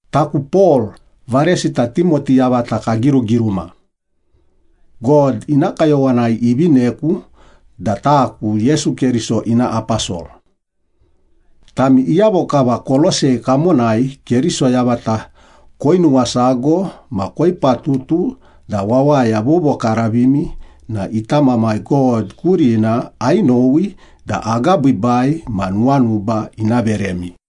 Taku Pol, varesita Timoti yavata kagirugiruma. God ina kayowanai ivineku da taku Yesu Keriso ina aposol. Tami iyavo kava Kolosei kamonai Keriso yavata koinuwasago ma koipatutu da wawaya vovokaravimi na ita Mamai God kurina ainowi da agabiibai ma nuwanuba ina veremi.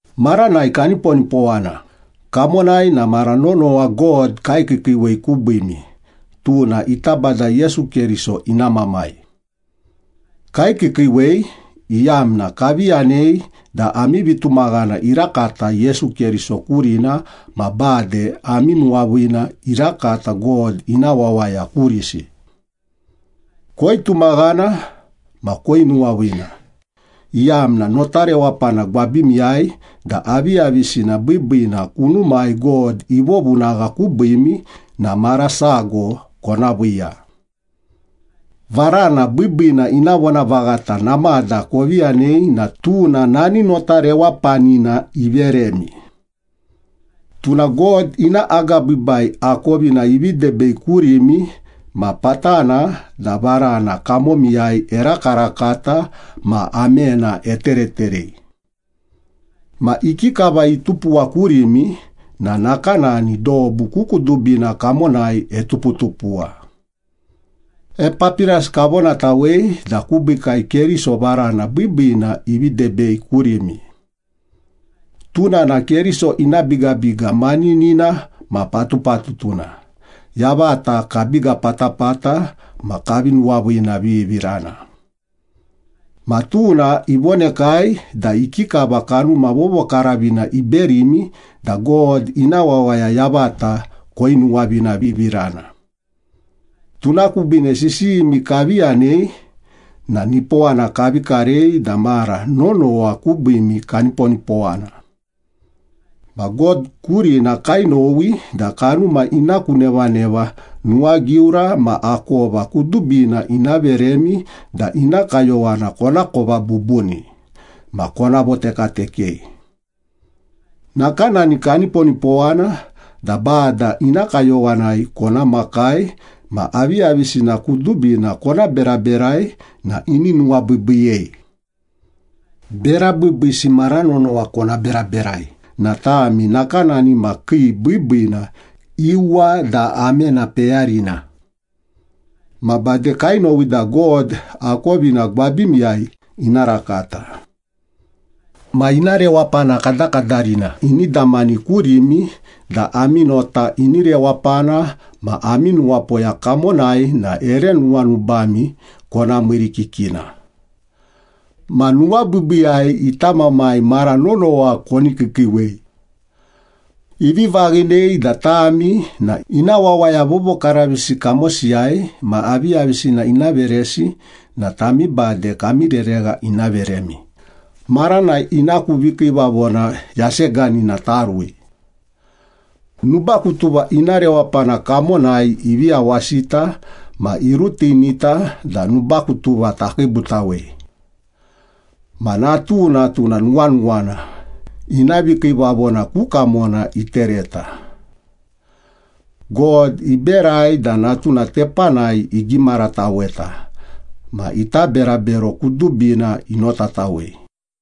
Maranai kaniponipowana, kamonai na mara nonowa God kaikiikiiwei kubiimi, tuna ita Bada Yesu Keriso ina Mamai. Kaikiikiiwei, iyamna kavi yanei da ami vitumaghana irakata Yesu Keriso kurina ma bade ami nuwaviina irakata God ina wawaya kurisi. Koitumaghana ma koinuwaviina, iyamna nota rewapana gwabimiyai da aviyavisina biibiina kunumai God ivovunagha kubiimi na mara sago kona viiya. Varana biibiina ina vonavaghata namada kovi yanei na tuna nani nota rewapanina iveremi. Tuna God ina agabiibai akovina ivi debei kurimi ma patana da varana kamomiyai erakarakata ma amena etereterei. Ma ikikava itupuwa kurimi na nakanani dobu ku kudubina kamonai etuputupuwa. Epapiras kavonatawei da kubiikai Keriso varana biibiina ivi debei kurimi. Tuna na Keriso ina bigabiga maninina ma patupatutuna, yavata kabiga patapata ma kavi nuwaviinavivirana. Ma tuna ivonekai da ikikava Kanuma Vovokaravina iberimi da God ina wawaya yavata koinuwaviinavivirana. Tuna kubiine sisiyimi kavi yanei na nipowana kavi karei da mara nonowa kubiimi kaniponipowana. Ma God kurina kainowi da kanuma ina ku nevaneva nuwagiura ma akova kudubina ina veremi da ina kayowana konakova bubuni ma kona votekatekei. Nakanani kaniponipowana da Bada ina kayowanai kona makai ma aviyavisina kudubina kona beraberai na ini nuwabiibiiyei. Bera biibiisi mara nonowa kona beraberai na tami nakanani ma kii biibiina, iuwa da amena peyarina. Ma bade kainowi da God akovina gwabimiyai ina rakata. Ma ina rewapana kadakadarina ini damani kurimi da ami nota ini rewapana ma ami nuwapoya kamonai na ere nuwanubami kona miirikikina. Ma nuwabiibiiyai ita Mamai mara nonowa koni kiikiiwei. Ivi vaghinei da tami na ina wawaya vovokaravisi kamosiyai ma aviyavisina ina veresi na tami bade kami reregha ina veremi, maranai ina ku vikiivavona yaseganina tarui. Nubakutuva ina rewapana kamonai ivi yawasita ma irutinita da nubakutuva takiibutawei. Ma Natuna, tuna nuwanuwana, ina vikiivavona ku kamona itereta. God iberai da Natuna tepanai igimarataweta, ma ita berabero kudubina inotatawei.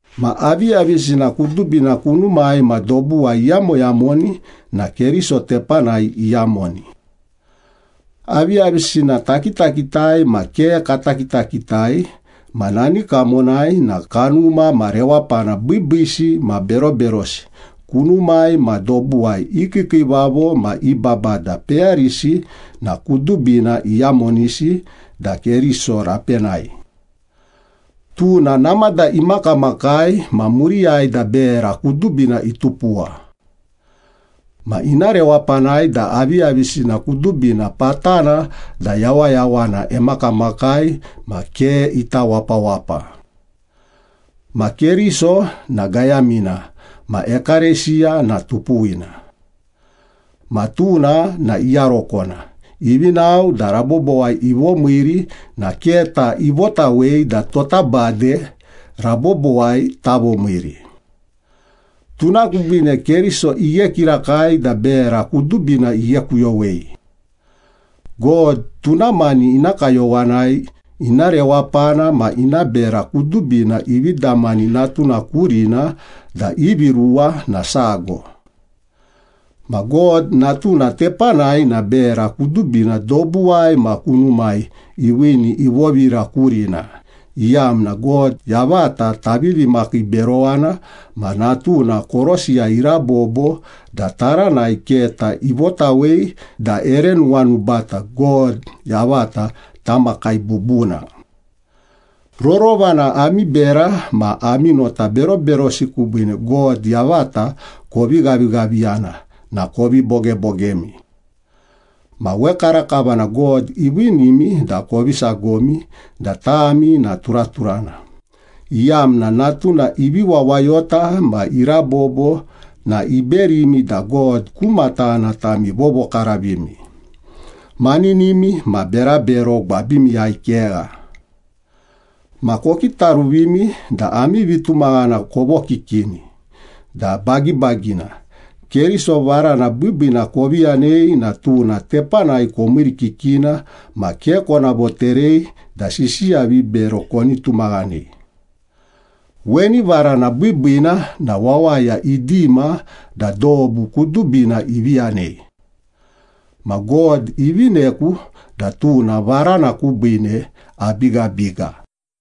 Ma aviyavisina kudubina kunumai ma dobuwai iyamoyamoni na Keriso tepanai iyamoni. Aviyavisina takitakitai ma ke kata kitakitai ma nani kamonai na kanuma ma rewapana biibiisi ma beroberosi kunumai ma dobuwai i kiikiivavo ma i babada peyarisi na kudubina iyamonisi da Keriso rapenai. Tuna namada imakamakai ma muriyai da bera kudubina itupuwa. Ma ina rewapanai da aviyavisina kudubina patana da yawayawana emakamakai ma ke ita wapawapa. Ma Keriso na gayamina ma ekalesiya na tupuwina. Ma tuna na iyarokona, ivi nao da rabobowai ivomiiri na keta ivotawei da tota bade rabobowai tavomiiri. Tuna kubiine Keriso ighe kirakai da bera kudubina ighekuyowei. God tuna mani ina kayowanai ina rewapana ma ina bera kudubina ivi damani Natuna kurina da ivi ruwa na sago. Ma God Natuna tepanai na bera kudubina dobuwai ma kunumai iviini ivovira kurina, iyamna God yavata tavivi makiiberowana ma Natuna korosiyai irabobo da taranai keta ivotawei da ere nuwanubata God yavata tamakai bubuna. Rorova na ami bera ma ami nota beroberosi kubiine God yavata kovi ghavighaviyana na kovi bogebogemi. Ma wekarakava na God iviinimi da kovi sagomi da tami na turaturana, iyamna Natuna ivi wawayota ma irabobo na iberimi da God ku matana tami vovokaravimi, maninimi ma berabero gwabimiyai kegha. Ma kokitaruvimi da ami vitumaghana kovokikini da bagibagina. Keriso varana biibiina kovi yanei na tuna tepanai komiirikikina ma ke kona voterei da sisiya vibero koni tumaghanei. Weni varana biibiina na wawaya idima da dobu kudubina ivi yanei. Ma God ivineku da tuna varana kubiine abigabiga.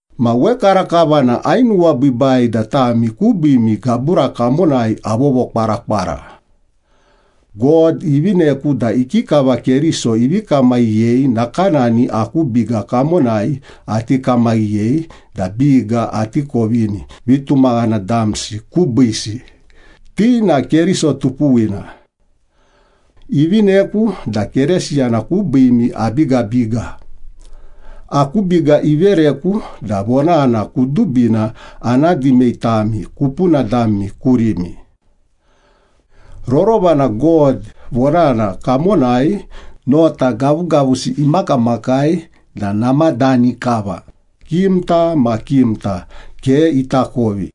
Ma wekarakava na ainuwabiibai da tami kubiimi gabura kamonai avovokwarakwara. God ivineku da ikikava Keriso ivi kamaghiyei nakanani aku biga kamonai ati kamaghiyei da biga ati kovini vitumaghana damsi kubiisi, ti na Keriso tupuwina. Ivineku da Keresiyana kubiimi abigabiga, aku biga ivereku da vonana kudubina ana dimei tami kupuna dami kurimi. Rorova na God vonana kamonai nota gavugavusi imakamakai da namadani kava, kimta ma kimta ke itakovi.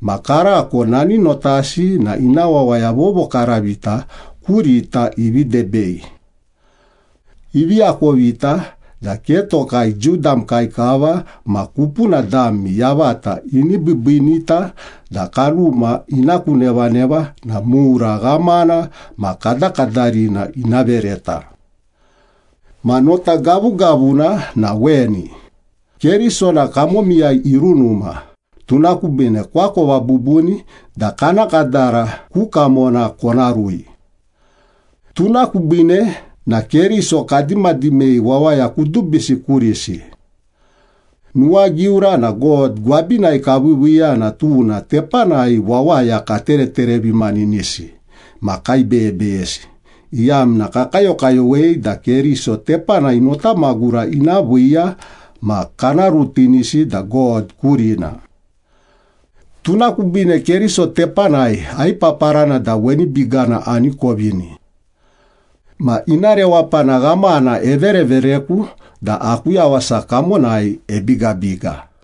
Ma karako nani notasi na ina wawaya vovokaravita kurita ivi debei. Ivi akovita da ke tokai Jiu damkai kava ma kupuna dami yavata ini biibiinita da kanuma ina ku nevaneva na mura ghamana ma kadakadarina ina vereta. Ma nota gavugavuna na weni, Keriso na kamomiyai irunuma, tuna kubiine koakova bubuni da kana kadara ku kamona kona rui. Tuna kubiine na Keriso kadimadimei wawaya kudubisi kurisi. Nuwagiura na God gwabinai kaviiviiya na tuna tepanai wawaya katereterevimaninisi ma kaibeyebeyesi, iyamna kakayokayowei da Keriso tepanai nota magura ina viiya, ma kana rutinisi da God kurina. Tuna kubiine Keriso tepanai aipaparana da weni bigana ani kovini. Ma ina rewapana ghamana everevereku da aku yawasa kamonai ebigabiga.